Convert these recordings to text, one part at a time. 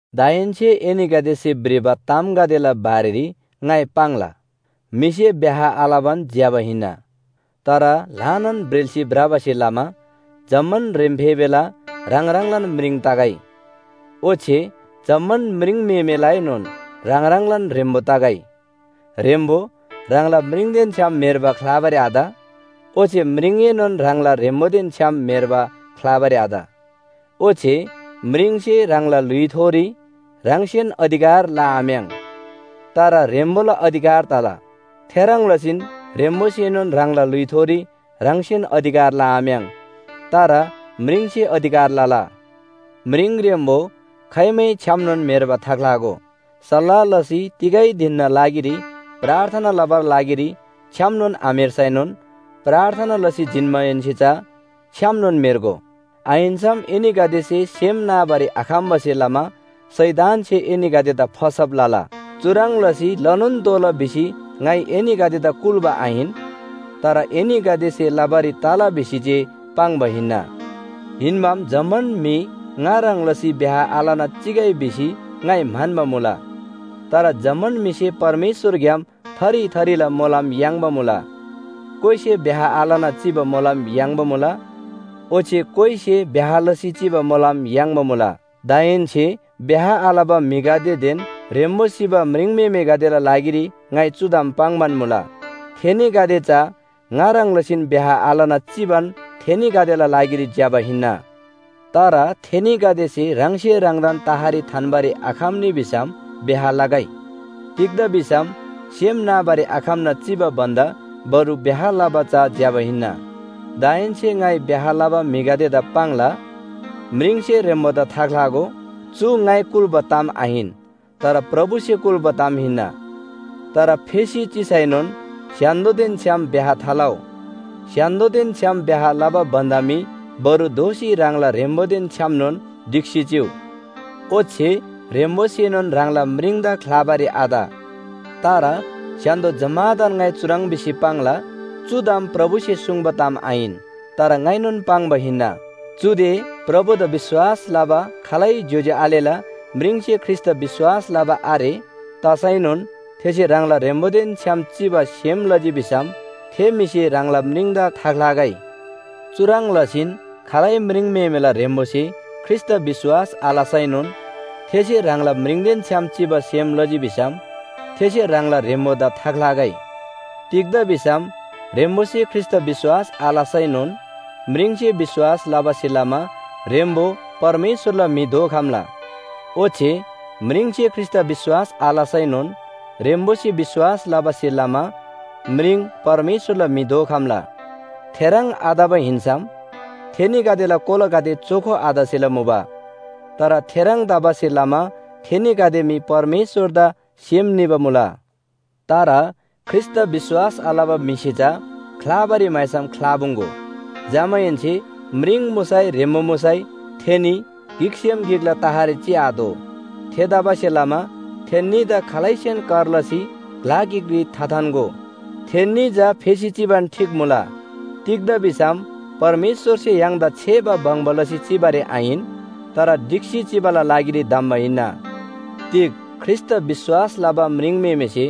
दाहेन्‍से एनीगदेसे भ्रिबा तामगदेला बारेरी ङाइ पाङ्ला। म्‍हिसे ब्‍याह आलबान ज्‍यबा हिन्‍ना। तर ल्‍हानान ब्रेल्‍सी भ्रबासे लमा जम्‍मान ह्रेम्‍फेबेला ह्राङ ह्राङलान म्रिङ तगै, ओच्‍छे जम्‍मान म्रिङम्‍हेमेलाएनोन ह्राङ ह्राङलान ह्रेम्‍बो तगै। ह्रेम्‍बो ह्राङला म्रिङदेन छ्‌याम म्‍हेर्बा ख्‍लाबारी आत। ओच्‍छे म्रिङएनोन ह्राङला ह्रेम्‍बोदेन छ्‌याम म्‍हेर्बा ख्‍लाबारी आत। ओच्‍छे म्रिङसे ह्राङला ल्‍हुइथोरी ह्राङसेन अधिकार लआम्‍याङ्, तर ह्रेम्‍बोला अधिकार तला। थेह्रङ् लसीन ह्रेम्‍बोसेनोन ह्राङला ल्‍हुइथोरी ह्राङसेन अधिकार लआम्‍याङ्, तर म्रिङसे अधिकार लला। म्रिङ ह्रेम्‍बो खाइमै छ्‌यामनोन म्‍हेर्बा थाख्‍लागो। सल्‍लाह लसी तिगै धिनना लागिरी प्रार्थना लबाला लागिरी छ्‌यामनोन आम्‍हेर्सैनोन प्रार्थना लसी जिन्‍माहेन्‍से चा छ्‌यामनोन म्‍हेर्गो। आहिन्‍सम एनीगदेसे सेम नाबारी आखम्‍बासे लमा शैतानसे एनीगदेदा फसब लला। चुह्रङ् लसी लनोन तोःला भिसी ङाइ एनीगदेदा कुल्‍बा आहिन। तर एनीगदेसे लबारी तला भिसी जे पाङ्बा हिन्‍ना। हिन्‍बाम जम्‍मान म्‍हि ङा ह्रङ् लसी ब्‍याह आलना चिगै भिसी ङाइ म्‍हन्‍बा मुला। तर जम्‍मान म्‍हिसे परमेश्‍वरग्‍याम थरी थरीला मोलम याङ्बा मुला, कोइसे ब्‍याह आलना चिबा मोलम याङ्बा मुला ओच्‍छे कोइसे ब्‍याह लसी चिबा मोलम याङ्बा मुला। दाहेन्‍से ब्‍याह आलबा म्‍हिगदेदेन ह्रेम्‍बो सिबा म्रिङम्‍हेमेगदेला लागिरी ङाइ चु ताम पाङ्‌बान मुला, थेनीगदे चा ङा ह्रङ् लसीन ब्‍याह आलना चिबान थेनीगदेला लागिरी ज्‍यबा हिन्‍ना। तर थेनीगदेसे ह्राङसे ह्राङदान तहरी थान्‍बारी आखम्‍नी भिसम ब्‍याह लगै। तिग्‍दा भिसम सेम नाबारी आखम्‍ना चिबा भन्‍दा बरु ब्‍याह लबा चा ज्‍यबा हिन्‍ना। दाहेन्‍से ङाइ ब्‍याह लबा म्‍हिगदेदा पाङ्ला, म्रिङसे ह्रेम्‍बोदा थाख्‍लागो। चु ङाइ कुल्‍बा ताम आहिन, तर प्रभुसे कुल्‍बा ताम हिन्‍ना। तर फेसी चिसैनोन स्‍य्‍हान्‍दोदेन छ्‌याम ब्‍याह थालउ। स्‍य्‍हान्‍दोदेन छ्‌याम ब्‍याह लबा भन्‍दा मी बरु दोःसी ह्राङला ह्रेम्‍बोदेन छ्‌यामनोन ढिक्‍सी चिउ। ओच्‍छे ह्रेम्‍बोसेनोन ह्राङला म्रिङदा ख्‍लाबारी आत। तर स्‍य्‍हान्‍दो जम्‍मादान ङाइ चुह्रङ् भिसी पाङ्ला, चु ताम प्रभुसे सुङ्बा ताम आहिन। तर ङाइनोन पाङ्बा हिन्‍ना। चुदे प्रभुदा विश्‍वास लबा खालै ज्‍योज्‍यो आलेला म्रिङसे ख्रीष्‍टदा विश्‍वास लबा आरे, तसैनोन थेसे ह्राङला ह्रेम्‍बोदेन छ्‌याम चिबा सेम लजी भिसम थे म्‍हिसे ह्राङला म्रिङदा थाख्‍लागै। चुह्रङ् लसीन खालै म्रिङम्‍हेमेला ह्रेम्‍बोसे ख्रीष्‍टदा विश्‍वास आलसैनोन थेसे ह्राङला म्रिङदेन छ्‌याम चिबा सेम लजी भिसम थेसे ह्राङला ह्रेम्‍बोदा थाख्‍लागै। तिग्‍दा भिसम ह्रेम्‍बोसे ख्रीष्‍टदा विश्‍वास आलसैनोन म्रिङसे विश्‍वास लबासे लमा ह्रेम्‍बो परमेश्‍वरला म्‍हि दोखम्‍ला। ओच्‍छे म्रिङसे ख्रीष्‍टदा विश्‍वास आलसैनोन ह्रेम्‍बोसे विश्‍वास लबासे लमा म्रिङ परमेश्‍वरला म्‍हि दोखम्‍ला। थेह्रङ् आतबा हिन्‍सम थेनीगदेला कोलागदे चोखो आतसेला मुबा। तर थेह्रङ् तबासे लमा थेनीगदे मी परमेश्‍वरदा सेम निबा मुला। तर ख्रीष्‍टदा विश्‍वास आलबा म्‍हिसे चा ख्‍लाबारी म्‍हाइसम ख्‍लापुङ्‌गो। जमाहेन्‍से म्रिङ मुसै ह्रेम्‍बो मुसै थेनी गिकसेम गिकला तहरी चिआतोः। थेतबासेलमा थेन्‍नीदा खालैसेन कर लसी ग्‍ला गिकरी थाथान्‍गो। थेन्‍नी चा फेसी चिबान ठीक मुला, तिग्‍दा भिसम परमेश्‍वरसे य्‍हाङदा छेबा बङ्बा लसी चिबारी आहिन, तर ढिक्‍सी चिबाला लागिरी धम्‍बा हिन्‍ना। तिग ख्रीष्‍टदा विश्‍वास लबा म्रिङम्‍हेमेसे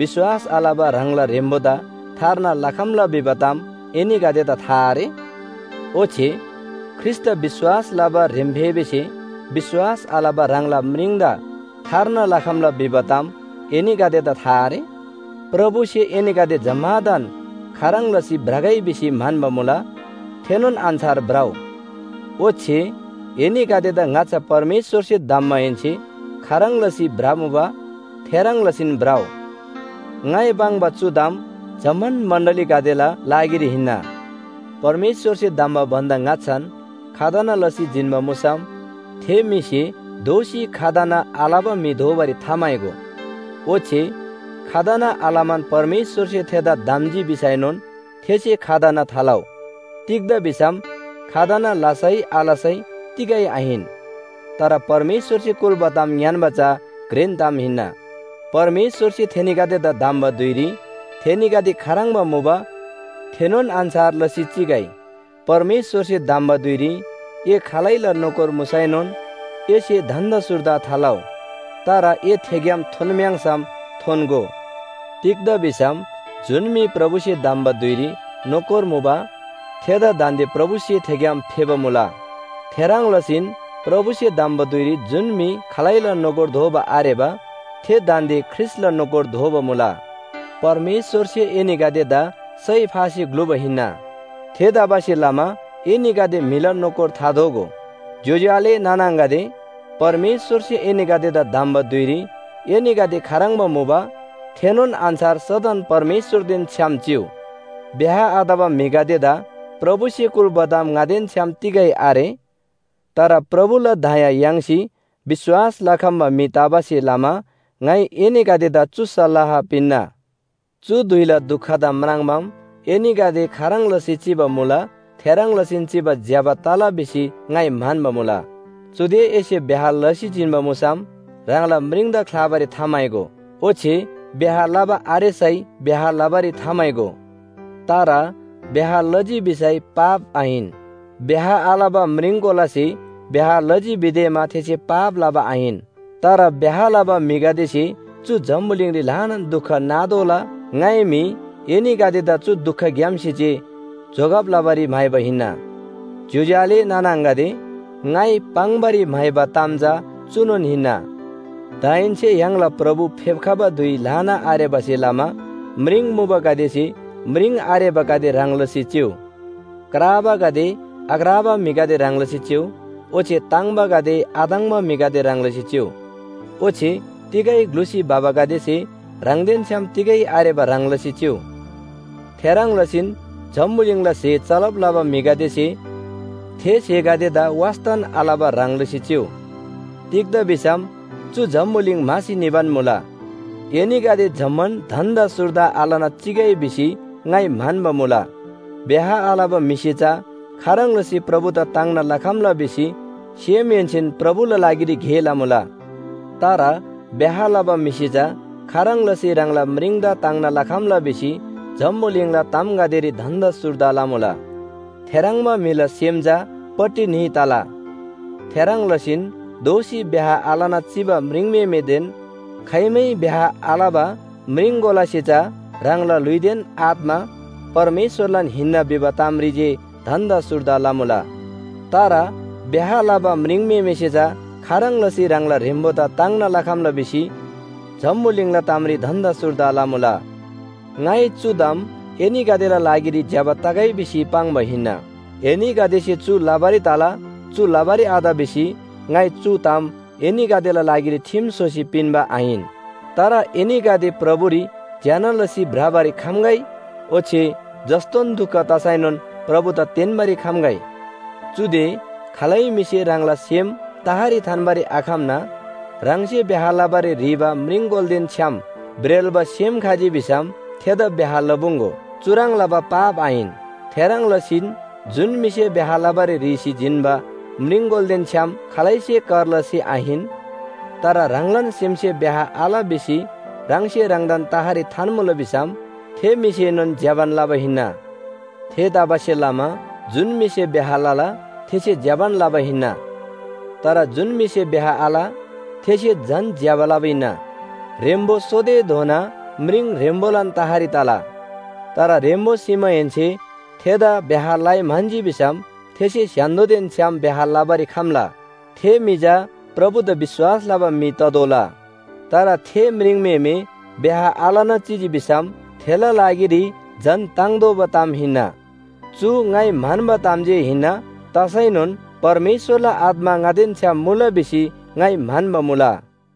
विश्‍वास आलबा ह्राङला ह्रेम्‍बोदा थार्ना लखम्‍ला भिबा ताम एनीगदेदा था आरे? ओच्‍छे ख्रीष्‍टदा विश्‍वास लबा ह्रेम्‍फेबेसे विश्‍वास आलबा ह्राङला म्रिङदा थार्ना लखम्‍ला भिबा ताम एनीगदेदा था आरे? प्रभुसे एनीगदे जम्‍मादान खाह्रङ् लसी भ्रगै भिसी म्‍हन्‍बा मुला थेनोन अन्‍छार भ्रउ। ओच्‍छे एनीगदेदा ङाच्‍छा परमेश्‍वरसे धम्‍माहेन्‍से खाह्रङ् लसी भ्रमुबा थेह्रङ् लसीन भ्रउ। ङाइ पाङ्बा चु ताम जम्‍मान मण्‍डलीगदेला लागिरी हिन्‍ना। परमेश्‍वरसे धम्‍बा भन्‍दा ङाच्‍छान खतना लसी जिन्‍बा मुसम थे म्‍हिसे दोःसी खतना आलबा म्‍हि दोबारी थाम्‍हाइगो। ओच्‍छे खतना आलमान परमेश्‍वरसे थेदा धम्‍जी भिसैनोन थेसे खतना थालउ। तिग्‍दा भिसम खतना लसै आलसै तिगै आहिन। तर परमेश्‍वरसे कुल्‍बा ताम ङ्‌यान्‍बा चा घ्रेन ताम हिन्‍ना। परमेश्‍वरसे थेनीगदेदा धम्‍बा धुइरी थेनीगदे खाह्रङ्बा मुबा थेनोन अन्‍छार लसी चिगै। परमेश्‍वरसे धम्‍बा धुइरी ए खालैला नोकर मुसैनोन एसे धन्‍दा सुर्दा थालउ। तर ए थेग्‍याम थोन्‍म्‍याङ्‌सम थोन्‍गो। तिग्‍दा भिसम जुन म्‍हि प्रभुसे धम्‍बा धुइरी नोकर मुबा थेदा दान्‍दे प्रभुसे थेग्‍याम फेबा मुला। थेह्रङ् लसीन प्रभुसे धम्‍बा धुइरी जुन म्‍हि खालैला नोकर दोबा आरेबा थे दान्‍दे ख्रीष्‍टला नोकर दोबा मुला। परमेश्‍वरसे एनीगदेदा सय फासी ग्‍लुबा हिन्‍ना। थेतबासेलमा एनीगदे म्‍हिला नोकर थादोगो। ज्‍योज्‍यो आले नाना आङागदे, परमेश्‍वरसे एनीगदेदा धम्‍बा धुइरी एनीगदे खाह्रङ्बा मुबा थेनोन अन्‍छार सदन परमेश्‍वरदेन छ्‌याम चिउ। ब्‍याह आतबा म्‍हिगदेदा प्रभुसे कुल्‍बा ताम ङादेन छ्‌याम तिगै आरे। तर प्रभुला दया याङ्सी विश्‍वास लखम्‍बा म्‍हि तबासे लमा ङाइ एनीगदेदा चु सल्‍लाह पिन्‍ना। चु धुइला दुखदा म्राङ्‌माम एनीगदे खाह्रङ् लसी चिबा मुला थेह्रङ् लसीन चिबा ज्‍यबा तला भिसी ङाइ म्‍हन्‍बा मुला। चुदे एसे ब्‍याह लसी जिन्‍बा मुसम ह्राङला म्रिङदा ख्‍लाबारी थाम्‍हाइगो। ओच्‍छे ब्‍याह लबा आरेसै ब्‍याह लबारी थाम्‍हाइगो। तर ब्‍याह लजी भिसै पाप आहिन। ब्‍याह आलबा म्रिङकोलासे ब्‍याह लजी भिदेमा थेसे पाप लबा आहिन। तर ब्‍याह लबा म्‍हिगदेसे चु जम्‍बुलिङरी ल्‍हानान दुख नातोःला ङाइ मी एनीगदेदा चु दुखग्‍यामसे जे जोगब लबारी म्‍हाइबा हिन्‍ना। ज्‍योज्‍यो आले नाना आङागदे, ङाइ पाङ्‌बारी म्‍हाइबा ताम चा चुनोन हिन्‍ना। दाहेन्‍से य्‍हाङला प्रभु फेप्‍खबा धुइ ल्‍हाना आरेबासे लमा म्रिङ मुबागदेसे म्रिङ आरेबागदे ह्रङ् लसी चिउ। क्राबागदे आक्राबा म्‍हिगदे ह्रङ् लसी चिउ ओच्‍छे ताङ्बागदे आताङ्‌बा म्‍हिगदे ह्रङ् लसी चिउ। ओच्‍छे तिगै ग्‍लुसी भबागदेसे ह्राङदेन छ्‌याम तिगै आरेबा ह्रङ् लसी चिउ। थेह्रङ् लसीन जम्‍बुलिङला स्‍हे चलब लबा म्‍हिगदेसे थे स्‍हेगदेदा वास्‍तान आलबा ह्रङ् लसी चिउ। तिग्‍दा भिसम चु जम्‍बुलिङ म्‍हासी निबान मुला। एनीगदे जम्‍मान धन्‍दा सुर्दा आलना चिगै भिसी ङाइ म्‍हन्‍बा मुला। ब्‍याह आलबा म्‍हिसे चा खाह्रङ् लसी प्रभुदा ताङ्ना लखम्‍ला भिसी सेमहेन्‍सेन प्रभुला लागिरी गे लमुला। तर ब्‍याह लबा म्‍हिसे चा खाह्रङ् लसी ह्राङला म्रिङदा ताङ्ना लखम्‍ला भिसी जम्‍बुलिङला तामगदेरी धन्‍दा सुर्दा लमुला। थेह्रङ्बा म्‍हिला सेम चा पट्टि न्‍ही तला। थेह्रङ् लसीन दोःसी ब्‍याह आलना चिबा म्रिङम्‍हेमेदेन खाइमै ब्‍याह आलबा म्रिङकोलासे चा ह्राङला ल्‍हुइदेन आत्‍मा परमेश्‍वरलान हिन्‍ना भिबा तामरी जे धन्‍दा सुर्दा लमुला। तर ब्‍याह लबा म्रिङम्‍हेमेसे चा खाह्रङ् लसी ह्राङला ह्रेम्‍बोदा ताङ्ना लखम्‍ला भिसी जम्‍बुलिङला तामरी धन्‍दा सुर्दा लमुला। ङाइ चु ताम एनीगदेला लागिरी ज्‍यबा तगै भिसी पाङ्बा हिन्‍ना। एनीगदेसे चु लबारी तला, चु लबारी आत भिसी ङाइ चु ताम एनीगदेला लागिरी ठिम स्‍होसी पिन्‍बा आहिन। तर एनीगदे प्रभुरी ज्‍यना लसी भ्रबारी खम्‍गै ओच्‍छे जस्‍तोन दुख तसैनोन प्रभुदा तेन्‍बारी खम्‍गै। चुदे खालै म्‍हिसे ह्राङला सेम तहरी थान्‍बारी आखम्‍ना ह्राङसे ब्‍याह लबारी ह्रीबा म्रिङकोलादेन छ्‌याम ब्रेल्‍बा सेम खजी भिसम थेदा ब्‍याह लपुङ्‌गो। चुह्रङ् लबा पाप आहिन। थेह्रङ् लसीन जुन म्‍हिसे ब्‍याह लबारी ह्रीसी जिन्‍बा म्रिङकोलादेन छ्‌याम खालैसे कर लसी आहिन, तर ह्राङलान सेमसे ब्‍याह आल भिसी ह्राङसे ह्राङदान तहरी थान्‍मुला भिसम थे म्‍हिसेनोन ज्‍यबान लबा हिन्‍ना। थेतबासेलमा जुन म्‍हिसे ब्‍याह लला, थेसे ज्‍यबान लबा हिन्‍ना। तर जुन म्‍हिसे ब्‍याह आल, थेसे झन ज्‍यबा लबा हिन्‍ना। ह्रेम्‍बो सोतेधोना म्रिङ ह्रेम्‍बोलान तहरी तला। तर ह्रेम्‍बो सिमाहेन्‍से थेदा ब्‍याह लइ म्‍हन्‍जी भिसम थेसे स्‍य्‍हान्‍दोदेन छ्‌याम ब्‍याह लबारी खम्‍ला। थे म्‍हि चा प्रभुदा विश्‍वास लबा म्‍हि ततोःला। तर थे म्रिङम्‍हेमे ब्‍याह आलना चिजी भिसम थेला लागिरी झन ताङ्तोःबा ताम हिन्‍ना। चु ङाइ म्‍हन्‍बा ताम जे हिन्‍ना, तसैनोन परमेश्‍वरला आत्‍मा ङादेन छ्‌याम मुला भिसी ङाइ म्‍हन्‍बा मुला।